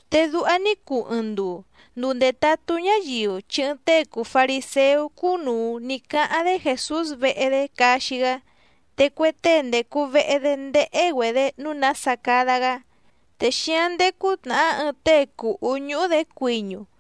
Te duha ní cuu ɨɨⁿ nduu, nduu ndètatú ñáyiu chi ɨɨⁿ tée cùu fariséú cúnùu ní cáháⁿ‑dé Jèsús vehe‑dé caxi‑gá, te cue tée ndècu vehe‑dé ndéhé‑güedě nǔu nása cada‑gá. Te xíáⁿ ndécú tnàhá ɨɨⁿ tée cùhú ñúhú‑dě cuiñu.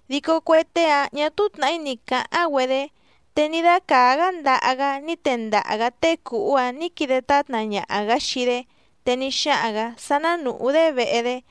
Dico cue tée‑áⁿ ñà túú tnàhí ni cǎháⁿ‑güedé. Te ní dácàá‑gá ndaha‑gá ní tendaha‑gǎ tée cùhú‑áⁿ nǐ quide tátna ñaha‑gǎ xii‑dé, te ní xáhaⁿ‑gǎ sá ná nùhú‑dé vehe‑dé.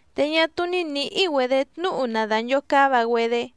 Te ñá túú ní nǐhí‑güedě tnúhu na dànchocáva‑güedé.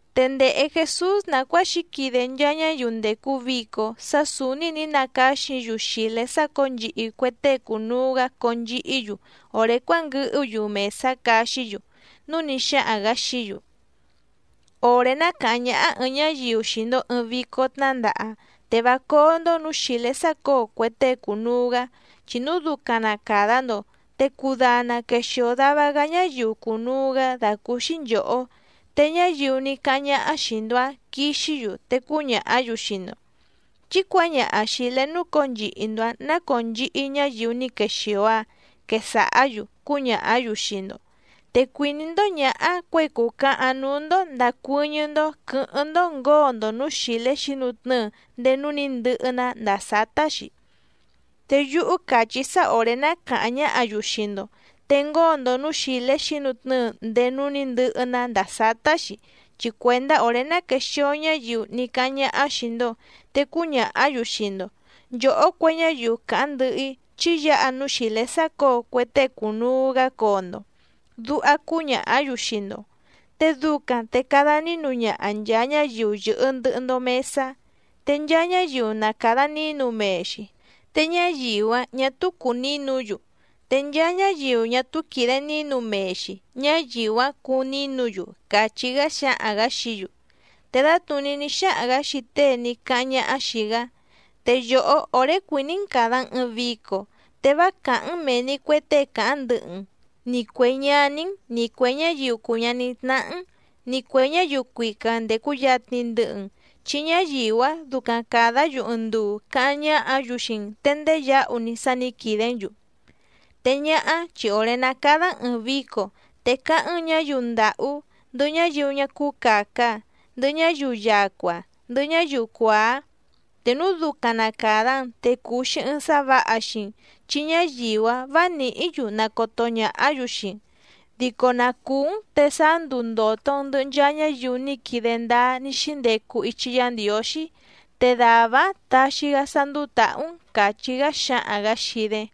Te ndèhe Jesús nàcuáa xǐquide nchaa ñáyiu ndècu vico sá sǔúní nǐ nacáxi‑yu xìlé sácǒo nchihi cue tée cùnuu‑gá conchihí‑yu òré cuánguɨhú‑yu mèsá caxí‑yu, núu ní xáhaⁿ‑gǎ xií‑yu: —Òré ná càháⁿ ñáhá ɨ̀ɨⁿ ñáyiu xii‑ndo ɨ̀ɨⁿ vico tnándaha, te vá cóó‑ndó nǔú xìlé sácǒo cue tée cùnuu‑gá, chi núu ducaⁿ na càda‑ndo, te cudana quexìo dava‑gá ñáyiu cùnuu‑gá dàcúúxí nchòhó. Te ñáyiu ní cáháⁿ ñáhá xìi‑ndo‑áⁿ quixí‑yu te cúñàhá‑yu xii‑ndo: “Chí cuǎñaha xìlé núcǒo nchihi‑ndo‑ǎⁿ ná cònchihi ñáyiu ní quexìo‑a”, quesàhá‑yu cúñàhá‑yu xii‑ndo. Te cuìní‑ndó ñǎhá cuěi cùcahaⁿ núú‑ndó ndàcuɨ́ñɨ́‑ndó quɨ̌hɨ́ⁿ‑ndó ngǒo‑ndo nǔú xìlé xǐnutnɨ́ɨ ndéé núú nǐ ndɨhɨ‑ná ndàa sátá‑xi. Te yúhú càchí‑í sá òré ná càháⁿ ñáhǎ‑yu xii‑ndo, te ngóo‑ndo nǔú xìlé xǐnutnɨ́ɨ ndéé núú nǐ ndɨhɨ‑ná ndàa sátá‑xi chi cuèndá òré ná quèxio ñáyiu ní cáháⁿ ñáhá xìi‑ndo, te cúñàhá‑yu xii‑ndo: “Nchòhó cue ñáyiu càháⁿ ndɨhɨ‑í, chí yǎha núú xìlé sácǒo cue tée cùnuu‑gá coo‑ndo”, duha cúñàhá‑yu xii‑ndo. Te ducaⁿ te cada nínu ñaha nchàa ñáyiu yɨ̀hɨ ndɨhɨ‑ndo mesá. Te nchaa ñáyiu na càda nínu mee‑xi, te ñáyiu‑áⁿ ñà túú cùu nínu‑yu, te nchaa ñáyiu ñá túú quìde nínu mee‑xi, ñáyiu‑áⁿ cúú nǐnu‑yu —càchí‑gá xáhaⁿ‑gǎ xií‑yu. Te dǎtnùní ní xáhaⁿ‑gǎ xii tée ní cáháⁿ ñáhá xìi‑gá: —Te yòhó òré cuìní‑n càda‑n ɨɨⁿ vico, te vá càháⁿ‑n mèe‑ni cue tée càháⁿ ndɨhɨ‑n, ni cuè ñaní‑n, ni cuè ñáyiu cùu ñaní tnáhá‑n, ni cuè ñáyiu cuica ndècu yatni ndɨhɨ‑n, chi ñáyiu‑áⁿ ducaⁿ càdá‑yu ɨɨⁿ nduu cáháⁿ ñáhǎ‑yu xii‑n te ndéyǎhu‑ni sá nǐ quìdé‑n‑yu. Te ñáhá chi òré ná càda‑n ɨɨⁿ vico, te cáháⁿ‑n ñǎyiu ndàhú, ndɨhɨ ñáyiu ñá cúú càca, ndɨhɨ ñáyiu yacua, ndɨhɨ ñáyiu cuàá. Te núu ducaⁿ na càda‑n, te cuu‑xi ɨɨⁿ sá vǎha xii‑n, chi ñáyiu‑áⁿ vǎ nìhí‑yu nacoto ñàhá‑yu xii‑n, dico na cùú‑n te sáá nduu ndòto‑n ndɨhɨ nchaa ñáyiu ní quide ndáá ní xíndecu ichi Yá Ndiǒxí, te dàvá‑áⁿ taxi‑gá sá ndúú tàhú‑n —càchí‑gá xáhaⁿ‑gǎ xii‑dé.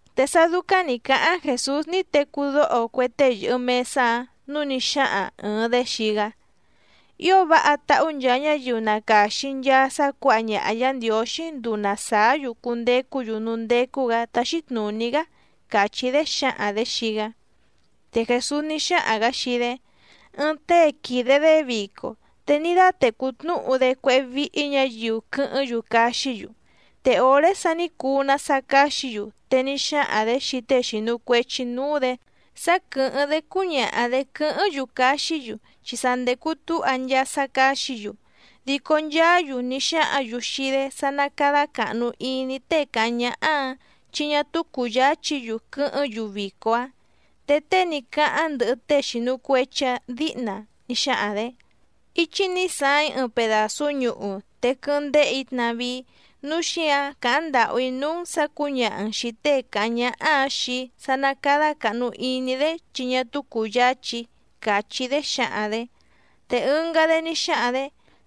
Te sá dúcáⁿ nǐ cáháⁿ Jèsús ní tecú dóho cue tée yɨ̀hɨ mesá‑áⁿ, núu ní xáhaⁿ ɨ̀ɨⁿ‑dé xii‑gá: —Ío váha táhú nchaa ñáyiu na càxi nchaa sá cuǎha ñaha Yǎ Ndiǒxí nduu na sàá‑yu cundecú‑yu núú ndécú‑gǎ táxí tnùní‑gá —càchí‑dé xǎhaⁿ‑dě xii‑gá. Te Jèsús ní xáhaⁿ‑gǎ xii‑dé: —Ɨɨⁿ tée quìde‑dé vico, te ní dátècú tnúhu‑dé cuéhé víhí ñǎyiu quɨ́hɨ́ⁿ‑yu caxí‑yu. Te òré sa ní cuu‑ná sá cáxǐ‑yu, te ní xáhaⁿ‑dě xii tée xìnu cuechi núú‑dě sá quɨ̀hɨ́ⁿ‑dé cúñaha‑dě quɨ́hɨ́ⁿ‑yu caxí‑yu, chi sa ndècu túha nchaa sá cáxǐ‑yu. Dico nchaá‑yu ní xáhǎⁿ‑yu xii‑dé sá ná cádá càhnu iní tée càháⁿ ñáhá‑ǎⁿ, chi ñá túú cùyáchí‑yu quɨ́hɨ́ⁿ‑yu vico‑áⁿ. Te tée ní cáháⁿ ndɨhɨ tée xìnu cuechi‑áⁿ dǐhna ní xáhaⁿ‑dě: “Íchí nǐ saaⁿ‑í ɨɨⁿ pedàsú ñuhu, te quɨ́hɨ́ⁿ ndéhè‑í tnavíí, núu xíǎⁿ càháⁿ ndàhú‑í núú‑n sǎ cǔñaha‑n xìi tée càháⁿ ñáhá‑ǎⁿ xii‑í sá ná cádá càhnu iní‑dé chi ñá túú cùyáchí‑í”, càchí‑dé xǎhaⁿ‑dě. Te ɨngá‑dé ní xáhaⁿ‑dě: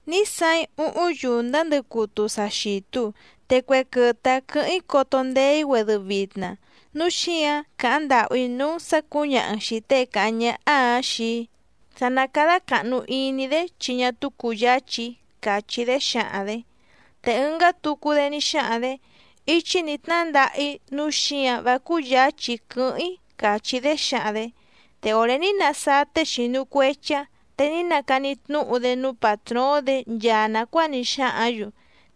“Ní saaⁿ‑í úhúⁿ yùndá ndɨcutu sa xìtu, te cue quɨtɨ‑áⁿ quɨ̌hɨ́ⁿ‑í coto ndeé‑í‑güedɨ vitna, núu xíǎⁿ càháⁿ ndàhú‑í núú‑n sǎ cǔñaha‑n xìi tée càháⁿ ñáhá‑ǎⁿ xii‑í sá ná cádá càhnu iní‑dé chi ñá túú cùyáchí‑í”, càchí‑dé xǎhaⁿ‑dě. Te ɨngá tucu‑dé ní xáhaⁿ‑dě: “Íchí nǐ tnándaha‑í nǔu xíǎⁿ vá cúyǎchí‑í quɨ́hɨ́ⁿ‑í”, càchí‑dé xǎhaⁿ‑dě. Te òré ní nasáá tée xìnu cuechi‑áⁿ, te ní nacani tnúhu‑dé núú pàtróóⁿ‑dě nchaa nàcuáa ní xáhǎⁿ‑yu.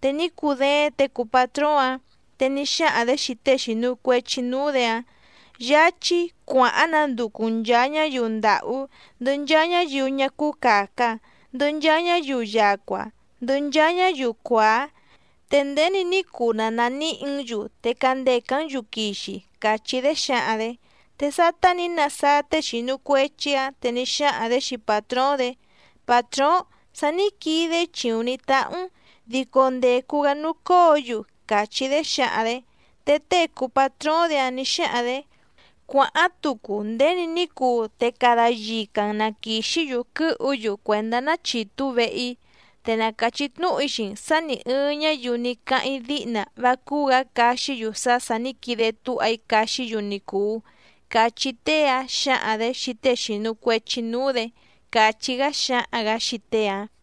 Te ní cudééⁿ těe cùu patróóⁿ‑ǎⁿ, te ní xáhaⁿ‑dě xii tée xìnu cuechi núú‑dě‑áⁿ: “Yáchí cuàháⁿ nanducu‑n nchàa ñáyiu ndàhú, ndɨhɨ nchaa ñáyiu ñá cúú càca, ndɨhɨ nchaa ñáyiu yacua, ndɨhɨ nchaa ñáyiu cuàá, te nděni ní cuu na nàníhǐ‑n‑yu te candècá‑n‑yu quixi”, càchí‑dé xǎhaⁿ‑dě. Te sátá nǐ nasáá tée xìnu cuechi‑áⁿ, te ní xáhaⁿ‑dě xii pàtróóⁿ‑dě: “Pàtróóⁿ, sa ní quide‑í chìuⁿ ní táhú‑n, dico ndècu‑gá núú cóo‑yu”, càchí‑dé xǎhaⁿ‑dě. Te tée cùu patróóⁿ‑dě‑áⁿ nǐ xáhaⁿ‑dě: “Cuàháⁿ tucu nděni ní cuu te cada yica‑n na quìxí‑yu quɨ́hu‑yu cuèndá ná chìtú vehe‑í. Te na càchí tnúhu‑í xii‑n sǎ nì ɨɨⁿ ñáyiu ní cáháⁿ‑í díhna vá cúú‑gǎ caxí‑yu sá sà ní quide túha‑í caxí‑yu ni cùu”, cachí tée‑áⁿ xǎhaⁿ‑dě xii tée xìnu cuechi núú‑dě —càchí‑gá xáhaⁿ‑gǎ xii tée‑áⁿ.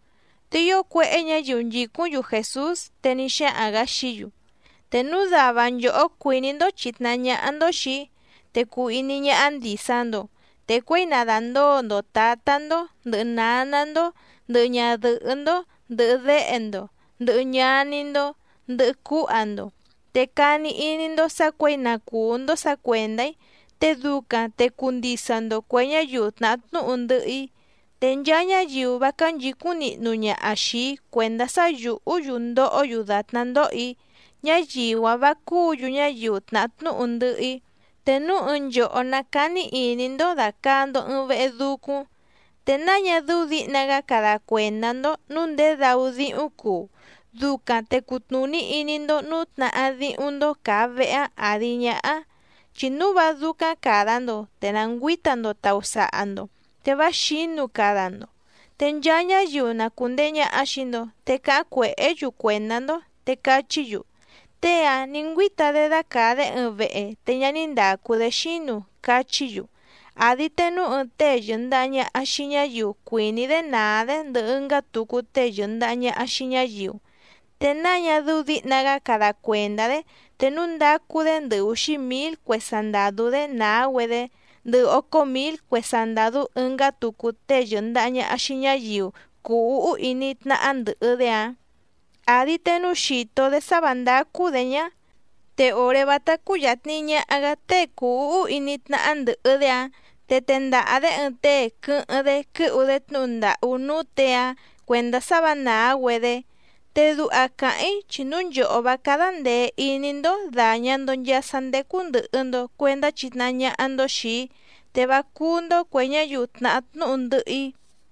Te ío cuéhé ñǎyiu nchìcúⁿ‑yu Jèsús, te ní xáhaⁿ‑gǎ xií‑yu: —Te núu dava nchòhó cuìní‑ndó chìtnahá ñáhá‑ndó xìi‑í, te cuu iní ñáhá ndìsa‑ndo. Te cuěi na dàndóo‑ndo tǎtá‑ndó, ndɨ̀hɨ náná‑ndó, ndɨ̀hɨ ñadɨhɨ́‑ndó, ndɨhɨ déhe‑ndo, ndɨhɨ ñaní‑ndó, ndɨhɨ cúha‑ndo, te cani iní‑ndó sǎ cuěi na cùú‑ndó sǎ cuèndá‑í, te ducaⁿ te cuu ndisa‑ndo cuè ñáyiu tnàhá tnúhu ndɨhɨ‑í. Te nchaa ñáyiu vá cánchǐcúⁿ nihnu ñaha xìi‑í cuèndá sá yùhú‑yu ndohó‑yu dàtná ndoho‑í, ñáyiu‑áⁿ vǎ cúǔ‑yu ñáyiu tnahá tnúhu ndɨhɨ‑í. Te núu ɨɨⁿ nchòhó ná càni iní‑ndó dàcaa‑ndo ɨɨⁿ vehe ducúⁿ, ¿te náa ñá dɨ́ú dǐhna‑gá cada cuèndá‑ndó nǔu ndědau díhúⁿ cuu, ducaⁿ te cutnùní iní‑ndó nǔu tnahá díhúⁿ‑ndó càa vehe‑áⁿ àdi ñáhá? Chi núu vá dúcáⁿ càda‑ndo, te na ngüǐta‑ndo tàusaha‑ndo te vá xǐnu cada‑ndo, te nchaa ñáyiu na cùndehe ñaha xii‑ndo, te cáháⁿ cuèhé‑yu cuèndá‑ndó. Te cachí‑yu: “Tée‑ǎⁿ ní ngüíta‑dé dácàa‑dé ɨɨⁿ vehe te ñá ní ndàcu‑dé xínu”, cachí‑yu. Àdi te núu ɨɨⁿ tée yɨ̀ndaha ñaha xii ñáyiu cuìní‑dé nàá‑dé ndɨhɨ ɨngá tucu tée yɨ̀ndaha ñaha xii ñáyiu, ¿te náa ñá dɨ́ú dǐhna‑gá cada cuèndá‑dé te núu ndacu‑dé ndɨhɨ úxí mǐl cue sandàdú‑dé nàá‑güedé, ndɨhɨ ócó mǐl cue sandàdú ɨngá tucu tée yɨ̀ndaha ñaha xii ñáyiu cùu úhú iní tnáhá ndɨ̀hɨ‑dé‑ǎⁿ? Àdi te núu xìto‑dé sá vǎ ndácú‑dě ñá, te òré vátá cúyàtni ñaha‑gá tée cùu úhú iní tnáhá ndɨ̀hɨ‑dé‑áⁿ, te tendaha‑dě ɨɨⁿ tée quɨ́hɨ́ⁿ‑dé quɨ́hu‑dé tnúhu ndàhú núú těe‑áⁿ cuèndá sá vǎ nàá‑güedé. Te duha càháⁿ‑í chi núu nchòhó vá cádá ndèe iní‑ndó dàña‑ndo nchaa sá ndécú ndɨ̀hɨ‑ndo cuendá chitnahá ñáhá‑ndó xìi‑í, te vá cúú‑ndó cuè ñáyiu tnàhá tnúhu ndɨhɨ‑í.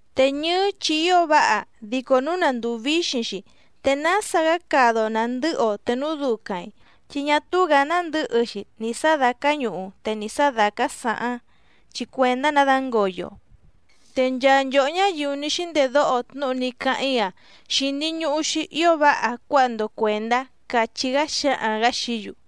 ’Te ñɨ́ɨ́ chi ío váha, dico núu na ndùu víxiⁿ‑xi, ¿te nása‑gá cada‑o nàndɨ́hɨ‑o te núu ducaⁿ‑i? Chi ñá túú‑gǎ nándɨ̌hɨ‑xi nì sá dàcá ñuhu, te nì sá dàcá saháⁿ, chi cuèndá‑nǎ dǎngoyo‑o. Te nchaa nchòhó ñáyiu ní xíndedóho tnúhu ní cáháⁿ‑í‑a xìni ñuhu‑xi ío váha cuáha‑ndo cuèndá —càchí‑gá xáhaⁿ‑gǎ xií‑yu.